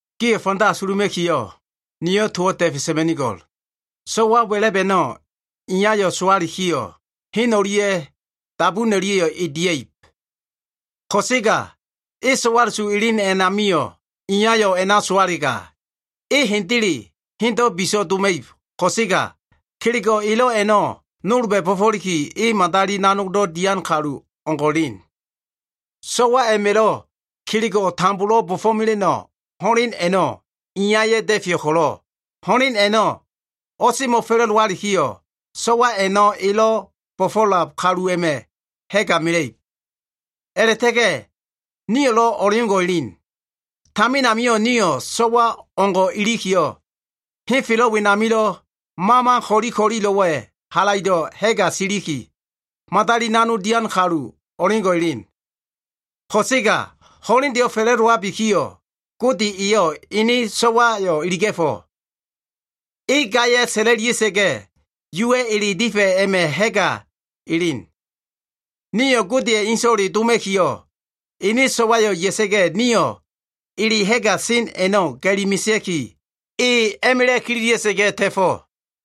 Gio꞉ fanda asuluma꞉kiyo꞉, niyo꞉ towo꞉ da꞉fe sa꞉ma꞉nigo꞉l. So꞉wa wa꞉la꞉b a꞉no꞉ iyayo꞉ sowalikiyo꞉, hen o꞉lia꞉ dabun o꞉lia꞉yo꞉ e dia꞉ib. Ko꞉sega e so꞉wala꞉su elen ami iyayo꞉ a꞉na sowalega, e hendele hendo꞉ biso꞉ doma꞉ib. Ko꞉sega kelego꞉ elo꞉ a꞉no꞉ nolba꞉ bo꞉fo꞉liki e madali nanog dian kalu o꞉ngo꞉ elen. So꞉wa a꞉ma꞉lo꞉ kelego꞉ tambolo꞉ bo꞉fo꞉mela꞉no꞉ ho꞉len a꞉no꞉ iyaya꞉ da꞉feyo꞉ ko꞉lo꞉, ho꞉len a꞉no꞉ o꞉semo꞉fa꞉la꞉dowalikiyo꞉, so꞉wa a꞉no꞉ elo꞉ bo꞉fo꞉lab kalu a꞉ma꞉ ha꞉ga mela꞉ib. A꞉la꞉ta꞉ga꞉ nio꞉lo꞉ o꞉leo꞉ngo꞉ elen. Tamin amio꞉ nio꞉ so꞉wa o꞉ngo꞉ ilikiyo꞉, henfelo꞉ wenamilo꞉ mama ko꞉li ko꞉lilo꞉wa꞉ halaido꞉ ha꞉ga siliki, madali nanog dian kalu o꞉ngo꞉ elen. Ko꞉sega ho꞉lendeyo꞉ fa꞉la꞉dowabikiyo꞉, Gode eyo꞉ ene so꞉wayo꞉ iliga꞉fo꞉. E gaya꞉yo꞉ sa꞉la꞉lia꞉sa꞉ga꞉, Yuwa꞉ ele difa꞉ a꞉ma꞉ ha꞉ga elen. Nio꞉ Godeya꞉ ene So꞉wale doma꞉kiyo꞉, ene so꞉wayo꞉ ya꞉sa꞉ga꞉, nio꞉ ele ha꞉ga sen a꞉no꞉ ga꞉li mesea꞉ki, e a꞉ma꞉la꞉ kililia꞉sa꞉ga꞉ ta꞉fo꞉.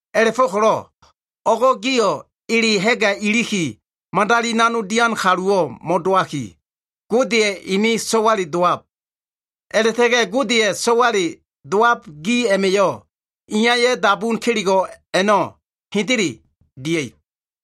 A꞉la꞉go꞉ko꞉lo꞉ o꞉go꞉ gio꞉ ele ha꞉ga iliki madali nanog dian kaluwo꞉ mo꞉dowaki, Godeya꞉ ene so꞉wale dowab. A꞉la꞉ta꞉ga꞉ Godeya꞉ so꞉wale dowab gi a꞉ma꞉yo꞉, iyaya꞉ dabun kelego꞉ a꞉no꞉ hendele dia꞉ib.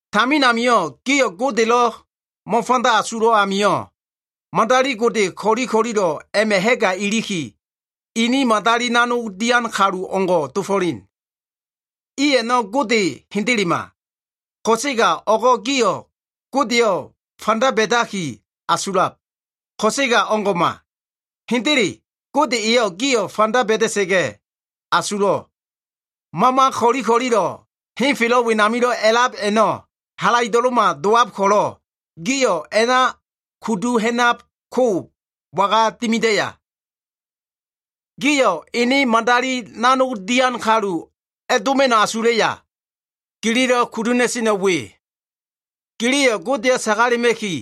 Tamin amio꞉ gio꞉ Godelo꞉ mo꞉fanda asulo꞉ amio꞉, madali gode ko꞉li ko꞉lilo꞉ a꞉ma꞉ ha꞉ga iliki, ini madali nanog dian kalu dofo꞉len. I a꞉no꞉ gode hendelema. Ko꞉sega o꞉go꞉ gio꞉ Godeyo꞉ fanda ba꞉daki asulab. Ko꞉sega o꞉ngo꞉ma. Hendele, Gode eyo꞉ gio꞉ fanda ba꞉da꞉sa꞉ga꞉ asulo꞉. Mama ko꞉li ko꞉lilo꞉ henfelo꞉ wenamilo꞉ a꞉lab a꞉no꞉ halaido꞉lo꞉ma dowab ko꞉lo꞉, gio꞉ a꞉na a꞉kudu ha꞉nab ko waga dimidaya? Gio꞉ ene madali nanog dian kalu a꞉doma꞉no꞉ asulaya? Gililo꞉ kudu ha꞉na꞉seno꞉ we. Giliyo꞉ Godeyo꞉ sagalema꞉ki,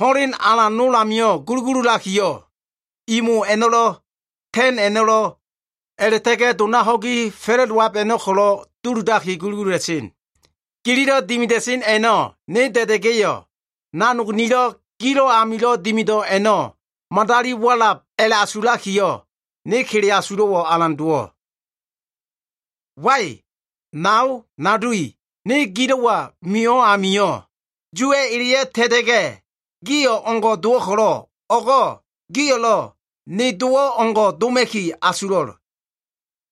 ho꞉len alan nol ami gulugululakiyo꞉, imo a꞉no꞉lo꞉, ta꞉n a꞉no꞉lo꞉, a꞉la꞉ta꞉ga꞉ dona ho꞉gi fa꞉la꞉dowab a꞉no꞉ ko꞉lo꞉ duludaki gulugulula꞉sen. Gililo꞉ dimida꞉sen a꞉no꞉ ne da꞉da꞉ga꞉yo꞉, nanog nilo꞉, gilo꞉ amilo꞉ dimido꞉ a꞉no꞉ madali walab a꞉la꞉asulakiyo꞉, ne kele asulo꞉wo꞉ alan dowo꞉. Wai! Nao nado i, ne gilo꞉wa mio꞉ amio꞉, Yuwa꞉ eleyo꞉ ta꞉ta꞉ga꞉, gi o꞉ngo꞉ dowo꞉ ko꞉lo꞉, o꞉go꞉ gio꞉lo꞉ ne dowo꞉ o꞉ngo꞉ doma꞉ki asulo꞉l.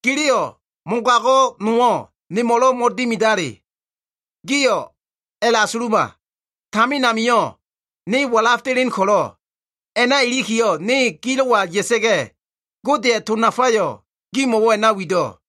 Giliyo꞉ mogago꞉ nowo꞉ nemo꞉lo꞉ mo꞉dimidale. Gio꞉ a꞉asuluma. Tamin amio꞉ ne walaf delen ko꞉lo꞉, a꞉na ilikiyo꞉ ne gilo꞉wa ya꞉sa꞉ga꞉, Godeya꞉ to nafayo꞉ gimo꞉wo꞉ a꞉na wido꞉.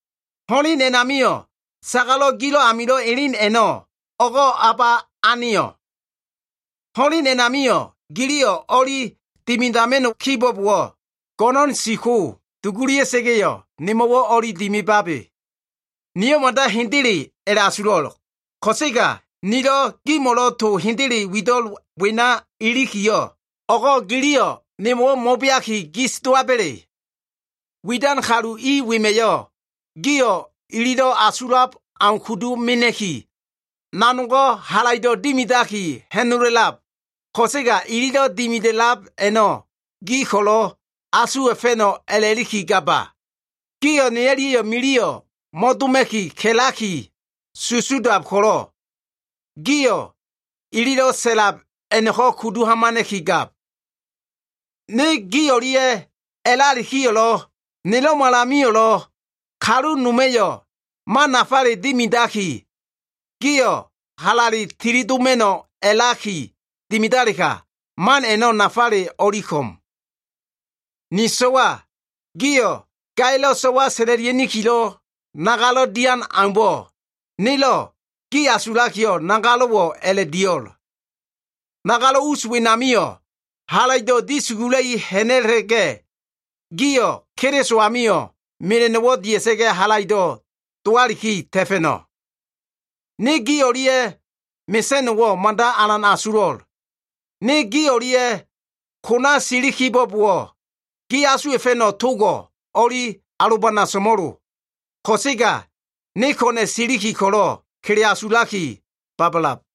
Ho꞉len a꞉namilo꞉ sagalo꞉ gilo꞉ amilo꞉ elen a꞉no꞉, o꞉go꞉ o꞉ba aneyo꞉? Ho꞉len a꞉namio꞉ giliyo꞉ o꞉li dimidama꞉no꞉ kibo꞉bowo꞉, go꞉no꞉n si ko dugulia꞉sa꞉ga꞉yo꞉ nemo꞉wo꞉ o꞉li dimibabe. Niyo꞉ mada hende a꞉la꞉asulo꞉. Ko꞉sega nilo꞉ gimo꞉lo꞉ to hendele wido꞉l wena ilikiyo꞉, o꞉go꞉ giliyo꞉ nemo꞉wo꞉ mo꞉beaki, gis dowaba꞉le? Widan kalu i wema꞉yo꞉ gio꞉ ililo꞉ asulab au kudu mena꞉ki, nanogo꞉ halaido꞉ dimidaki ha꞉nola꞉lab. Ko꞉sega ililo꞉ dimida꞉lab a꞉no꞉ gio꞉ ko꞉lo꞉ asuwa꞉fa꞉no꞉ a꞉la꞉liki ga꞉laba. Gio꞉ ne o꞉lia꞉yo꞉ miliyo꞉ mo꞉doma꞉ki ka꞉laki susudab ko꞉lo꞉, gio꞉ ililo꞉ sa꞉lab a꞉no꞉ko꞉ kudu hamana꞉ki gab. Ne gi o꞉lia꞉ a꞉lalikiyo꞉lo꞉, nelo꞉malamio꞉lo꞉, kalu noma꞉yo꞉ man nafale dimidaki, gio꞉ halale tili doma꞉no꞉ a꞉laki dimidalega, man a꞉no꞉ o꞉li nafaleyo꞉ ko꞉m. Ni so꞉wa gio꞉, gaya꞉lo꞉ so꞉wa sa꞉la꞉lia꞉nikilo꞉ nagalo꞉ dian aumbo꞉, nelo꞉ gi asulakiyo꞉ nagalo꞉wo꞉ a꞉la꞉ dio꞉l. Nagalo꞉ us wenamio꞉ halaido꞉ dia꞉i ha꞉na꞉la꞉ga꞉, gio꞉ Keliso amio꞉ mela꞉no꞉wo꞉ dia꞉sa꞉ga꞉ halaido꞉ dowaliki ta꞉fa꞉no꞉. Ne gi o꞉lia꞉ mesa꞉no꞉wo꞉ mada alan asulo꞉l. Ne gi o꞉lia꞉ kona siliki kibo꞉bowo꞉, gi asuwa꞉fa꞉no꞉ togo꞉ o꞉li alobana so꞉mo꞉lo. Ko꞉sega ne ko꞉na꞉ siliki ko꞉lo꞉ kele asulaki babalab.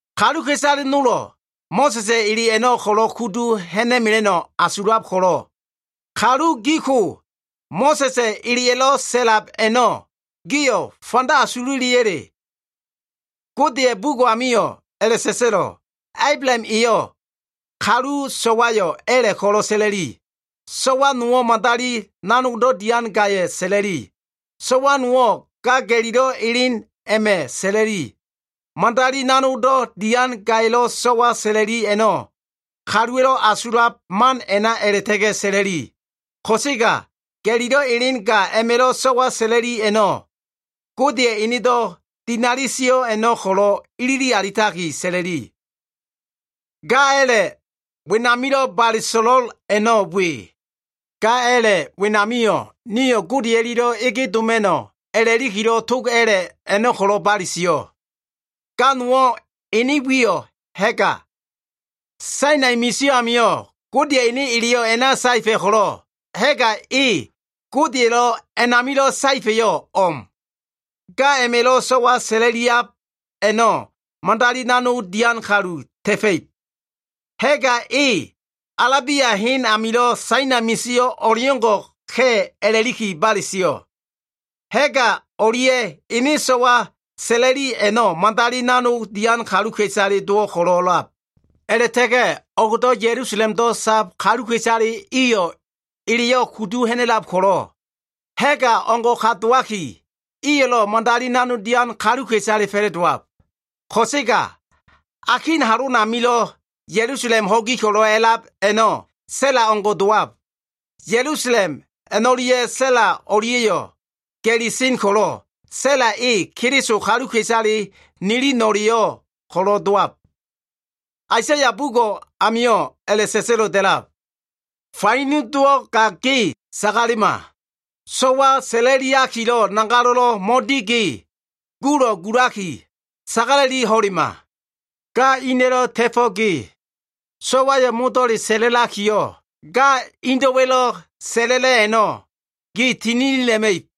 Kaluka꞉isale nolo꞉ Mo꞉sa꞉sa꞉ ele a꞉no꞉ ko꞉lo꞉ kudu ha꞉na꞉mela꞉no꞉ asulab ko꞉lo꞉, kalu gi ko Mo꞉sa꞉sa꞉ eleya꞉lo꞉ sa꞉lab a꞉no꞉ gio꞉ fanda asululiya꞉le? Godeya꞉ bugo꞉ amio꞉ a꞉la꞉sa꞉sa꞉lo꞉. Ablaham eyo꞉ kalu so꞉wayo꞉ a꞉la꞉ ko꞉lo꞉ sa꞉la꞉li. So꞉wa nowo꞉ madali nanogdo꞉ dian gaya꞉ sa꞉la꞉li. So꞉wa nowo꞉ ga ga꞉lilo꞉ elen a꞉ma꞉ sa꞉la꞉li. Madali nanogdo꞉ dian gaya꞉lo꞉ so꞉wa sa꞉la꞉li a꞉no꞉ kaluwa꞉lo꞉ asulab man a꞉na a꞉la꞉ta꞉ga꞉ sa꞉la꞉li. Ko꞉sega ga꞉lilo꞉ elen ga a꞉ma꞉lo꞉ so꞉wa sa꞉la꞉li a꞉no꞉, Godeya꞉ enedo꞉ dinali sio꞉ a꞉no꞉ ko꞉lo꞉ ilili alitaki sa꞉la꞉li. Ga a꞉la꞉ wenamilo꞉ bale so꞉lo꞉l a꞉no꞉ we. Ga a꞉la꞉ wenamio꞉, nio꞉ Gode o꞉lia꞉lo꞉ ege doma꞉no꞉ a꞉la꞉likilo꞉ tog a꞉la꞉ a꞉no꞉ ko꞉lo꞉ bale sio꞉. Ga nowo꞉ ene wiyo꞉ Ha꞉ga. Sainai misio꞉ amio꞉ Godeya꞉ ene eleyo꞉ a꞉na saefa꞉ ko꞉lo꞉, Ha꞉ga e Godeya꞉lo꞉ a꞉namilo꞉ saefa꞉yo꞉ o꞉m. Ga a꞉ma꞉lo꞉ so꞉wa sa꞉la꞉liab a꞉no꞉ madali nanog dian kalu ta꞉fa꞉ib. Ha꞉ga e Alabia hen amilo꞉ Sainai misio꞉ o꞉leo꞉ngo꞉ ka꞉ a꞉la꞉liki bale sio꞉. Ha꞉ga o꞉lia꞉ ene so꞉wa sa꞉la꞉li a꞉no꞉ madali nanog dian kaluka꞉isale dowo꞉ ko꞉lo꞉lab. A꞉la꞉ta꞉ga꞉ o꞉gdo꞉ Ya꞉lusalemdo꞉ sab kaluka꞉isale iyo꞉ eleyo꞉ kudu ha꞉na꞉lab ko꞉lo꞉, Ha꞉ga o꞉ngo꞉ ka dowaki, iyo꞉lo꞉ madali nanog dian kaluka꞉isale fa꞉la꞉dowab. Ko꞉sega akin halonamilo꞉ Ya꞉lusalem ho꞉gi a꞉lab a꞉no꞉ Sa꞉la o꞉ngo꞉ dowab. Ya꞉lusalem a꞉no꞉lia꞉ Sa꞉la o꞉lia꞉yo꞉ ga꞉li sen ko꞉lo꞉, Sa꞉la e Keliso kaluka꞉isale nili no꞉le ko꞉lo꞉ dowab. Aisaya bugo꞉ amio꞉ a꞉la꞉sa꞉sa꞉lo꞉ da꞉lab. “Faino dowo꞉ ga ge sagalema. So꞉wa sa꞉la꞉liakilo꞉ nagalo꞉lo꞉ mo꞉di ge, gulo꞉ gulaki, sagala꞉li ho꞉lema. Ga ina꞉lo꞉ ta꞉fo꞉ ge, so꞉wayo꞉ modo꞉le sa꞉la꞉lakiyo꞉, ga indo꞉wa꞉lo꞉ sa꞉la꞉la꞉ a꞉no꞉ gi tininila꞉ma꞉ib.”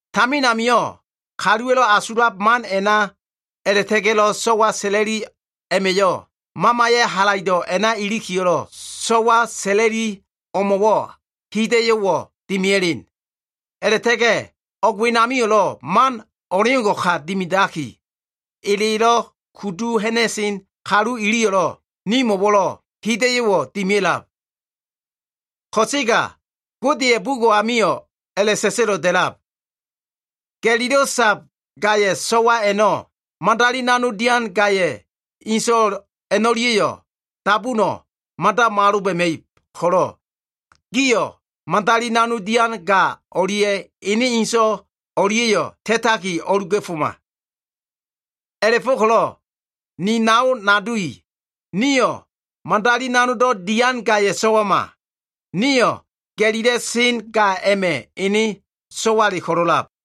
Tamin amio꞉ kaluwa꞉lo꞉ asulab man a꞉na a꞉la꞉ta꞉ga꞉lo꞉ so꞉wa sa꞉la꞉li a꞉ma꞉yo꞉, Mamaya꞉ halaido꞉ a꞉na ilikilo꞉ so꞉wa sa꞉la꞉li o꞉mo꞉wo꞉ hida꞉yo꞉wo꞉ dimia꞉len. A꞉la꞉ta꞉ga꞉ o꞉g wenamio꞉lo꞉ man o꞉leo꞉ngo꞉ka dimidaki, elelo꞉ kudu ha꞉na꞉sen kalu iliyo꞉, nimo꞉wo꞉lo꞉ hida꞉yo꞉wo꞉ dimia꞉lab. Ko꞉sega Godeya꞉ bugo꞉ a꞉namio꞉ a꞉la꞉sa꞉sa꞉lo꞉ da꞉lab. “Ga꞉lilo꞉ sab gaya꞉ so꞉wa a꞉no꞉, madali nanog dian gaya꞉ inso꞉ a꞉no꞉lia꞉yo꞉ dabuno꞉ mada mo꞉aloba꞉ma꞉ib ko꞉lo꞉, giyo꞉ madali nanog dian ga o꞉lia꞉ ene inso꞉ o꞉lia꞉yo꞉ ta꞉taki, o꞉luga꞉foma.” A꞉la꞉fo꞉ko꞉lo꞉ ni nao nado i, nio꞉ madali nanogdo꞉ dian gaya꞉ so꞉wama. Nio꞉ ga꞉lilo꞉ sen ga a꞉ma꞉ ene so꞉wale ko꞉lo꞉ a꞉lab.